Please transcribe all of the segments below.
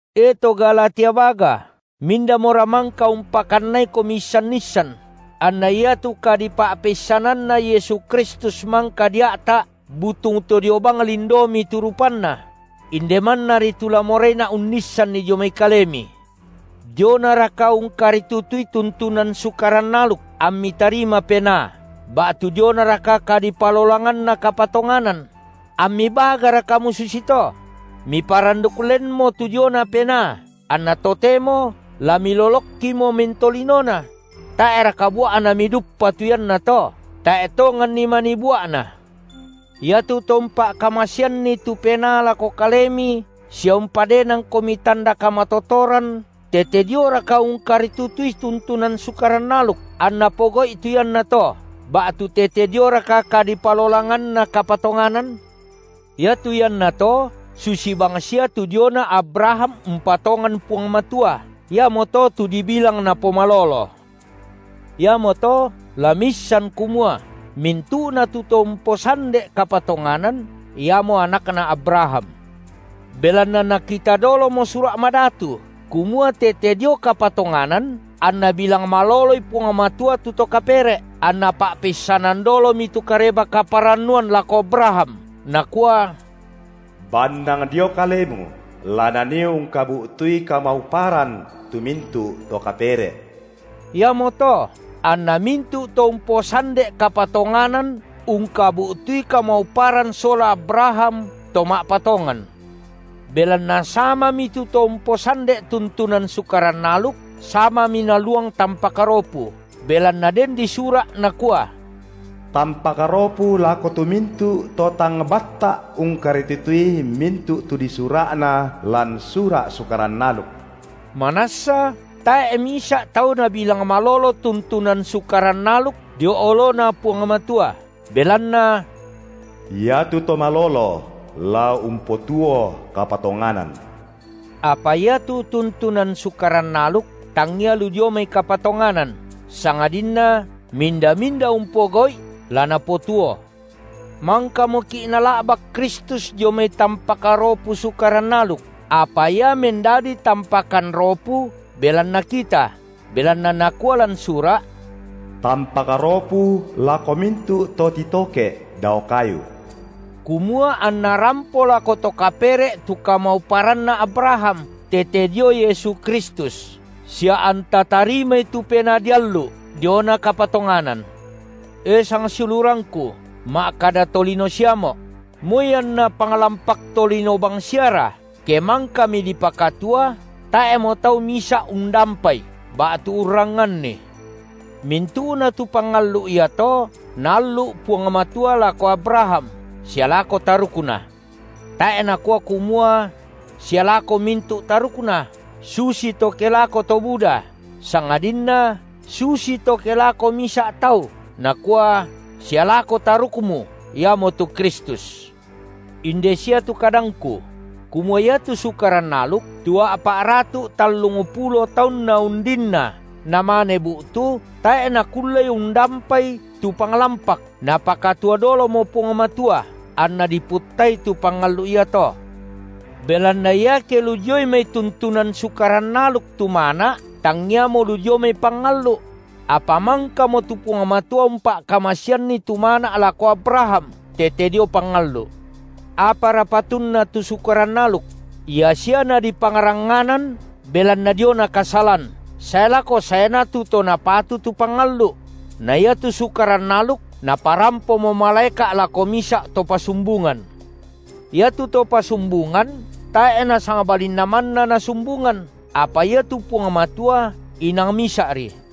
E to Galatia baga, mindamora mangka umpakannaikomi issan-issan, anna iatu kadipa’peissananNa Yesu Kristus mangka dia’ta’ butung to dio bang lindomi tu rupanNa? Inde mannari tu la moraina’ unnissanni dio mai kalemi: Dionaraka ungkaritutui tuntunan Sukaran aluk ammi tarima Penaa, ba’tu dionaraka kadipalolanganna kapatonganan? Ammi bagara kamu susito? Miparanduk lenmo tu diona Penaa, anna totemo la milolokkimo mentolinona? Tae’raka bua’na miduppa tu iannato? Tae’ tonganni manii bua’na. Iatu To umpa’kamaseanni tu Penaa lako kalemi sia umpadenangkomi tanda kamatotoran, tete dioraka ungkaritutui tuntunan Sukaran aluk, anNa pogau’i tu iannato, ba’tu tete dioraka kadipalolanganna kapatonganan? Iatu iannato susi bangsia tu diona Abraham umpatongan Puang Matua, iamoto tu dibilang napomalolo; iamoto la miissan kumua mintu’na tu to umposande’ kapatonganan, iamo anakna Abraham. Belanna nakita dolomo Sura’ Madatu, kumua tete dio kapatonganan anNa bilang maloloi Puang Matua tu to kapere’, anNa pa’peissanan dolomi tu Kareba-kaparannuan lako Abraham Nakua: Bannang dio kalemu la nanii ungkabu’tui kamauparan tu mintu’ to kapere’. Iamoto anna mintu’ to umposande’ kapatonganan ungkabu’tui kamauparan sola Abraham to ma’patongan. Belanna samami tu to umposande’ tuntunan Sukaran aluk, samami naluang tampak ropu, belanna den disura’ nakua: Tampak ropu lako tu mintu’ to tang batta’ ungkaritutui mintu’ tu disura’na lan sura’ Sukaran aluk. Manassa tae’ misa’ tau nabilang malolo tuntunan Sukaran aluk dio oloNa Puang Matua, belanna: Iatu to malolo la umpotuo kapatonganan. Apa iatu tuntunan Sukaran aluk tangia lu dio mai kapatonganan, sangadinna minda-minda umpogau’i la napotuo. Mangkamoki’ Nala’bak Kristus dio mai tampak ropu Sukaran aluk, apa Ia mendadi tampakan ropu belanna kita, belanna nakua lan sura’: Tampak ropu lako mintu’ to titoke’ dao kayu. Kumua anna rampo lako to kapere’ tu kamauparanna Abraham, tete dio Yesu Kristus, sia anta tarimai tu Penaa diallu’ diona kapatonganan. E sangsiulurangku, ma’kada tolino siamo’: moi anna panglampak tolino bangsiara, ke mangkami dipakatua, tae’mo tau misa’ undampai ba’tu urrangnganni. Mintu’na tu pangallu’ iato, Naallu’ Puang Matua lako Abraham sia lako tarukna. Tae’ Nakua kumua: Sia lako mintu’ tarukna, susito ke lako to buda, sangadinna susito ke lako Misa’ Tau, Nakua: Sia lako Tarukmu, iamotu Kristus. Inde sia tu kadangku: kumua iatu Sukaran aluk, tu a’pa’ratu’ tallungpulo taunna undinna namane bu’tu, tae’ nakullei undampai tu panglampak, Napakatua dolomo Puang Matua, anna diputtai tu pangallu’ iato. Belanna iake lu dioi mai tuntunan Sukaran aluk tu mana’, tangiamo lu dio mai pangallu’; apa mangkamo tu Puang Matua umpa’kamaseanni tu mana’ lako Abraham tete dio pangallu’. Apara patunna tu Sukaran aluk? ia sia nadipangrangnganan belanna diona kasalan, sae lako saeNa tu To napatu tu pangallu’; na iatu sukaran aluk naparampomo malaeka’ lako misa’ to pasumbungan. Iatu to pasumbungan tae’ nasangbalinna manna nasumbungan, apa iatu Puang Matua inang Misa’ri.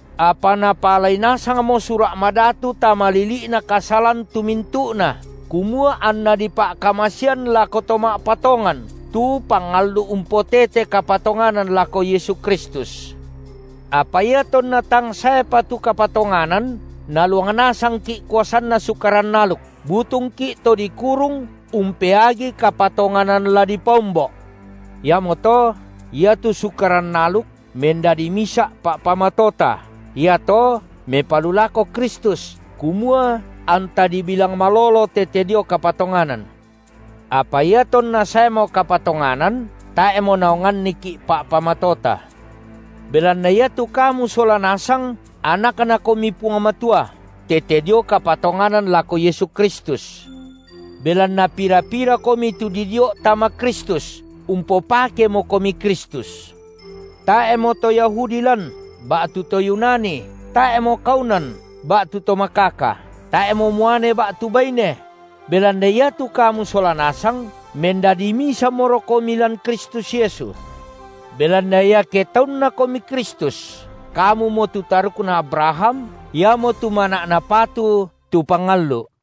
Apa napaalai nasangmo Sura’ Madatu tama lili’na kasalan tu mintu’na, kumua anna dipa’kamasean lako to ma’patongan tu pangallu’ umpotete kapatonganan lako Yesu Kristus. Apa iatonna tang saepa tu kapatonganan, naluang nasangki’ kuasanna Sukaran aluk, butungki’ to dikurung umpeagi kapatonganan la dipaombo’. Iamoto iatu Sukaran aluk mendadi misa’ pa’pamatota iato mepalulako Kristus, kumua anta dibilang malolo tete dio kapatonganan. Apa iatonna saemo kapatonganan, tae’mo naonganniki’ pa’pamatota. Belanna iatu kamu sola nasang anakNakomi Puang Matua tete dio kapatonganan lako Yesu Kristus. Belanna pira-pirakomi tu didio’ tama Kristus, umpopakemokomi Kristus. Tae’mo to Yahudi lan, ba’tu to Yunani, tae’mo kaunan ba’tu to makaka, tae’mo muane ba’tu baine; belanna iatu kamu sola nasang mendadi misamorokomi lan Kristus Yesu. Belanna iake taunnakomi Kristus, kamumo tu tarukna Abraham, iamotu mana’ napatu tu pangallu’.